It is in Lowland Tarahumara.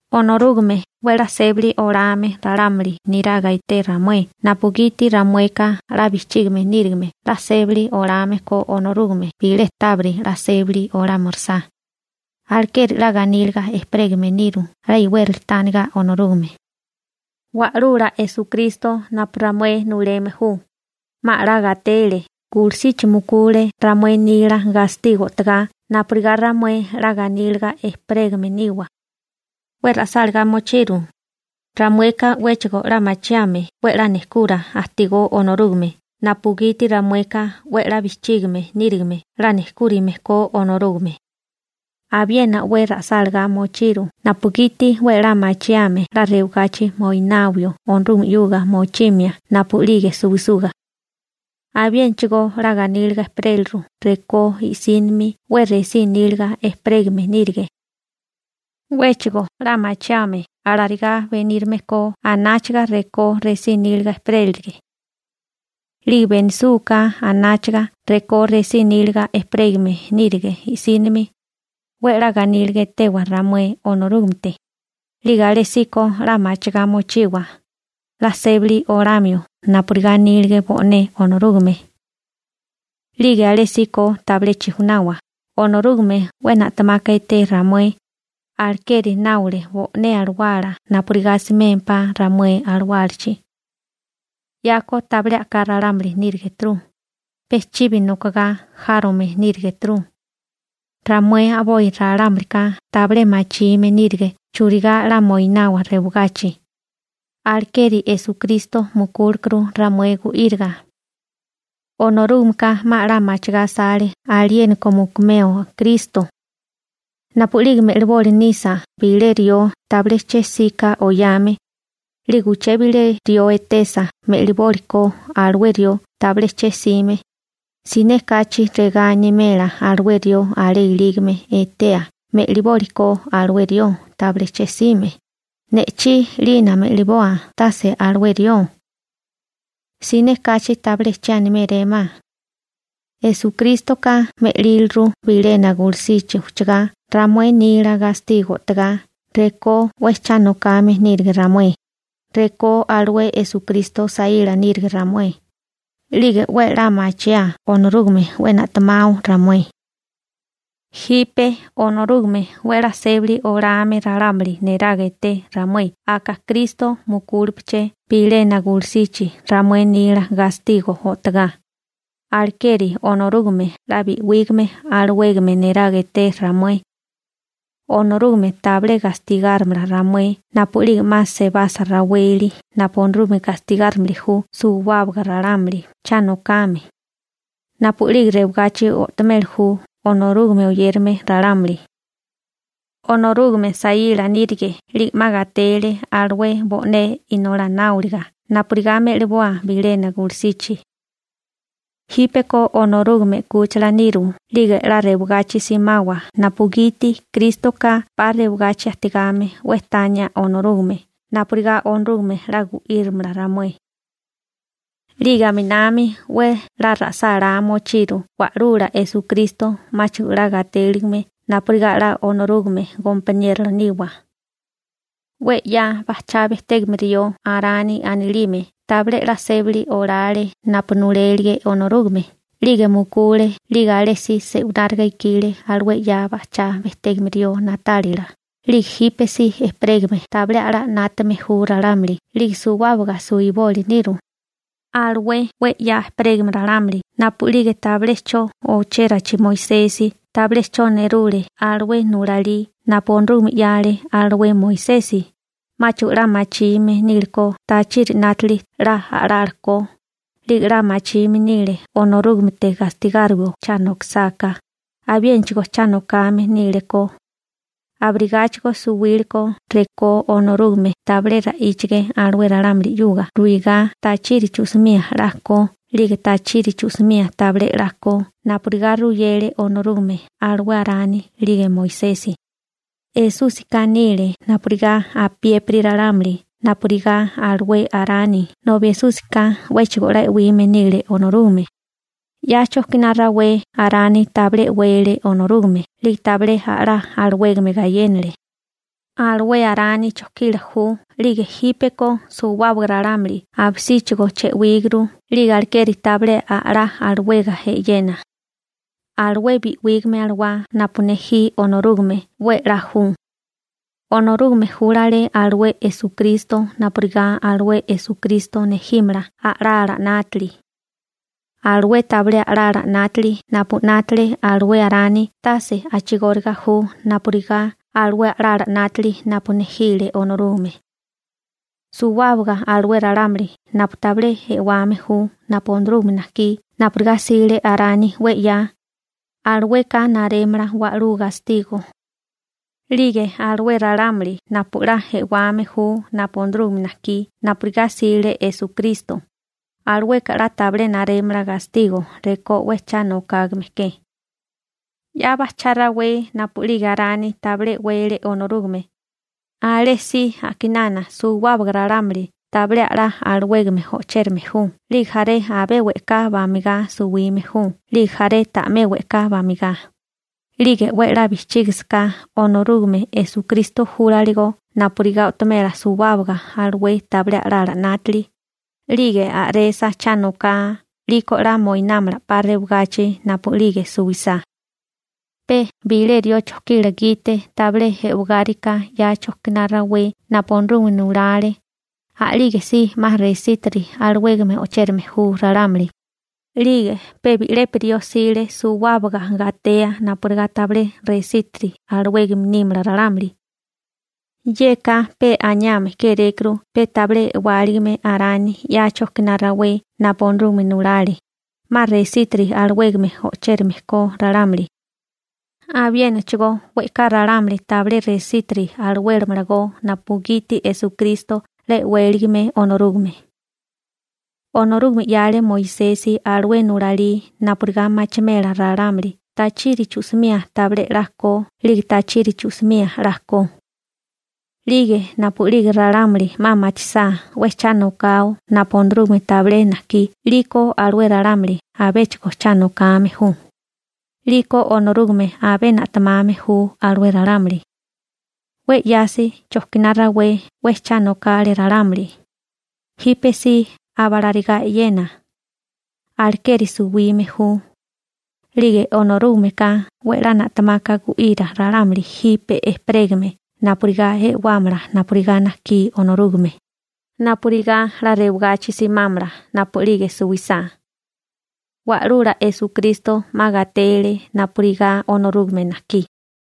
Onorúgame 'we 'la sébali olame ralámuli niraga eté ramué napugiti ramueka 'la bijchígime nírigime 'la sébali olame ko Onorúgame bilé tábiri 'la sébali olámirisá, alekeri 'la ganíliga ejperégame niru 'la iwérali tániga Onorúgame. Wa'lula Esukristo napu ramué nuleme ju, 'ma 'la gatele, gulusichi mukule ramué nila gastigo o'togá napurigá ramué 'la ganíliga ejperégame niwa. 'We ra'sáligá mochiru, ramueka 'wéchigo 'la machiame 'we 'la nejkura ajtigó Onorúgame napugiti ramueka 'we 'la bijchígime nírigime 'la nejkúrime ko Onorúgame. Abiena 'we ra'sálagá mochiru napugiti 'we 'la machiame 'la rewagachi moinawio Onorúgame 'yuga mochimia napu'lige suwisuga. Abiénachigo 'la ganíliga ejperélirukó rekó i'sínimi 'we resí níliga ejperégame nírige. 'Wéchigo 'la machiame alarigá benírame ko anáchaga rekó resí níliga ejperélirige. 'Lige benisúgaká anáchaga rekó resí níliga ejperégame nírige i'sínimi, 'we 'la ganíliga etewa ramué Onorúgamete, 'lige alésíko 'la machigá mochiwa 'la sébali olamio napurigá anílige bo'né Onorúgame. 'Lige alésíko tabilé chijunawa, Onorúgame 'we na'temaka eté ramué, alekeri náole bo'né alawala napurigá asimémpá ramué alawálachi. 'Yako tabilé a'ká ralámuli nírigeturu, pe chibi nokogá járome nírigeturu. Ramué a'boi ralámulika tabilé machime nírige churigá 'la moinawa rewagachi, alekeri Esukristo mukúlekuru ramué gu'íriga. Onorúgameka 'ma 'la machigá asale aliéniko mukumeo Kristo. Napu'lige me'liboli nisa bilé rió tabilé che'sika oyame, 'lige uché bilé rió etesa me'libólikó alué rió tabilé che'sime, siné kachi regá animela alué rió alé ilígame etea me'libólikó alué rió tabilé che'sime: «Ne'chí 'lina me'liboa, tase alué rió.» Siné kachi tabilé che animérémá. Esukrístoka me'líliru bilena gulusichi ujchagá ramué nila gastigo o'togá rekó 'we cha nokame nírige ramué, rekó alué Esukristo saíla nírige ramué, 'lige 'we a'lá machiaa Onorúgame 'we na'temao ramué. Jipe Onorúgame 'we 'la sébali olame ralámuli neraga eté ramué aka Kristo mukúlepeché bilena gulusichi ramué nila gastigo o'togá, alekeri Onorúgame 'la bi'wígame alawégame neraga eté ramué. Onorúgame tabilé gastigárimala ramué napu'lige 'ma sebasa raweli napu Onorúgame gastigárimili ju suwábaga ralámuli cha nokame, napu'lige rewagachi o'tomeli ju Onorúgame oyérame ralámuli. Onorúgame saíla nírige, 'lige 'ma gatele alué bo'né inolá náoliga napurigá me'liboa bilena gulusichi. Jípeko Onorúgame 'kúchila niru 'lige 'la rewagachi simawa napugiti Krístoka 'pa rewagachi ajtigame 'we tania Onorúgame napurigá Onorúgame 'la gu'írimala ramué. 'Lige aminami 'we 'la ra'sálá mochiru Wa'lula Esukristo 'máchigo 'la gatéligime napurigá 'la Onorúgame gompaniérola niwa. 'We 'ya bajchá bejtégame rió Arani anilime tabilé 'la sébali olale napu nulélige Onorúgame 'lige mukule 'lige alé si se'winárigá ikile alué 'ya bajchá bejtégame rió na'tálila 'lige jípesí ejperégame tabilé a'lá 'nátame ju ralámuli 'lige suwábaga suwiboli niru. Alué 'we 'ya ejperégame ralámuli napu'lige tabilé 'cho ochérachi Moisesi tabilé 'cho nerule alué nulalí napu Onorúgame 'yale alué Moisesi, 'máchigo 'la machime nílekó tachiri 'nátili 'la a'lala ko, 'lige 'la machime nile Onorúgamete gastigáriwio cha nokisáká, abiénachigo cha nokame nílekó. Abirigáchigo suwíleko rekó Onorúgame tabilé ra'íchige alué ralámuli 'yuga ruigá tachiri chu'simía 'la ko 'lige tachiri chu'simía tabilé 'la ko napurigá ruyele Onorúgame alué Arani 'lige Moisesi. Esúsika nile napurigá apiépiri ralámuli napurigá alué Arani nobi Esúsika 'wéchigo 'la e'wime nílekó Onorúgame. 'Ya chojkiná rawé Arani tabilé e'wele Onorúgame 'lige tabilé a'lá alawégame gayénale. Alué Arani chojkila ju 'lige jípeko suwábaga ralámuli abisíchigo che'wíguru 'lige alekeri tabilé a'lá alawega e'yena. Alué bi'wígame alawá napu nejí Onorúgame 'we 'la ju. Onorúgame júlale alué Esukristo napurigá alué Esukristo nejímala a'lala 'nátili. Alué tabilé a'lala 'nátili napu 'nátale alué Arani tase a'chigóriga ju napurigá alué a'lala 'nátili napu nejile Onorúgame. Suwábaga alué ralámuli napu tabilé e'wame ju napu Onorúgame najkí napurigá 'sile Arani 'we 'ya, alueka narémala wa'lú gastigo. 'Lige alué ralámuli napu 'la e'wame ju napu Onorúgame najkí napurigá 'sile Esukristo, alueka 'la tabilé narémala gastigo rekó 'we cha nokágame ke. 'Ya bajchá rawé napu'lige Arani tabilé e'wele Onorúgame, alé si a'kinana suwábaga ralámuli tabilé a'lá alawégame o'chérame ju 'lige jaré abé we'ká bamigá suwime ju 'lige jaré ta'mé we'ká bamigá, 'lige 'we 'la bijchígisaká Onorúgame Esukristo júlaligo napurigá o'tomela suwábaga alué tabilé a'lala 'nátili, 'lige a'resa cha noká 'liko 'la moinámala 'pa rewagachi napu'lige suwisá. Pe bilé rió chojkila gite tabilé e'wagáriká 'ya chojkiná rawé napu Onorúgame nulale, a'lígesí 'ma resítiri alawégame o'chérame ju ralámuli, 'lige pe bi'lepi rió 'sile suwábaga gatea napurigá tabilé resítiri alawégame nímala ralámuli. Yeka pe aniame kérékuru pe tabilé e'wáligame Arani 'ya chojkiná rawé napu Onorúgame nulale, 'ma resítiri alawégame o'chérame ko ralámuli. Abiénachigo we'ká ralámuli tabilé resítiri alawélamalagó napugiti Esukristo 'la e'wéligame Onorúgame. Onorúgame 'yale Moisesi alué nulalí napurigá machimela ralámuli tachiri chu'simía tabilé 'la ko 'lige tachiri chu'simía 'la ko. 'Lige napu'lige ralámuli 'ma machisá 'we cha nokao napu Onorúgame tabilé najkí 'liko alué ralámuli abéchigo cha nokame ju, 'liko Onorúgame abé na'temame ju alué ralámuli. 'We 'yasi chojkiná rawé 'we cha nokale ralámuli, jípesí abalarigá e'yena, alekeri suwime ju, 'lige Onorúgameka 'we 'la na'temaka gu'ira ralámuli jipe ejperégame napurigá e'wámala napurigá najkí Onorúgame, napurigá 'la rewagachi simámala napu'lige suwisá. Wa'lula Esukristo 'ma gatele napurigá Onorúgame najkí.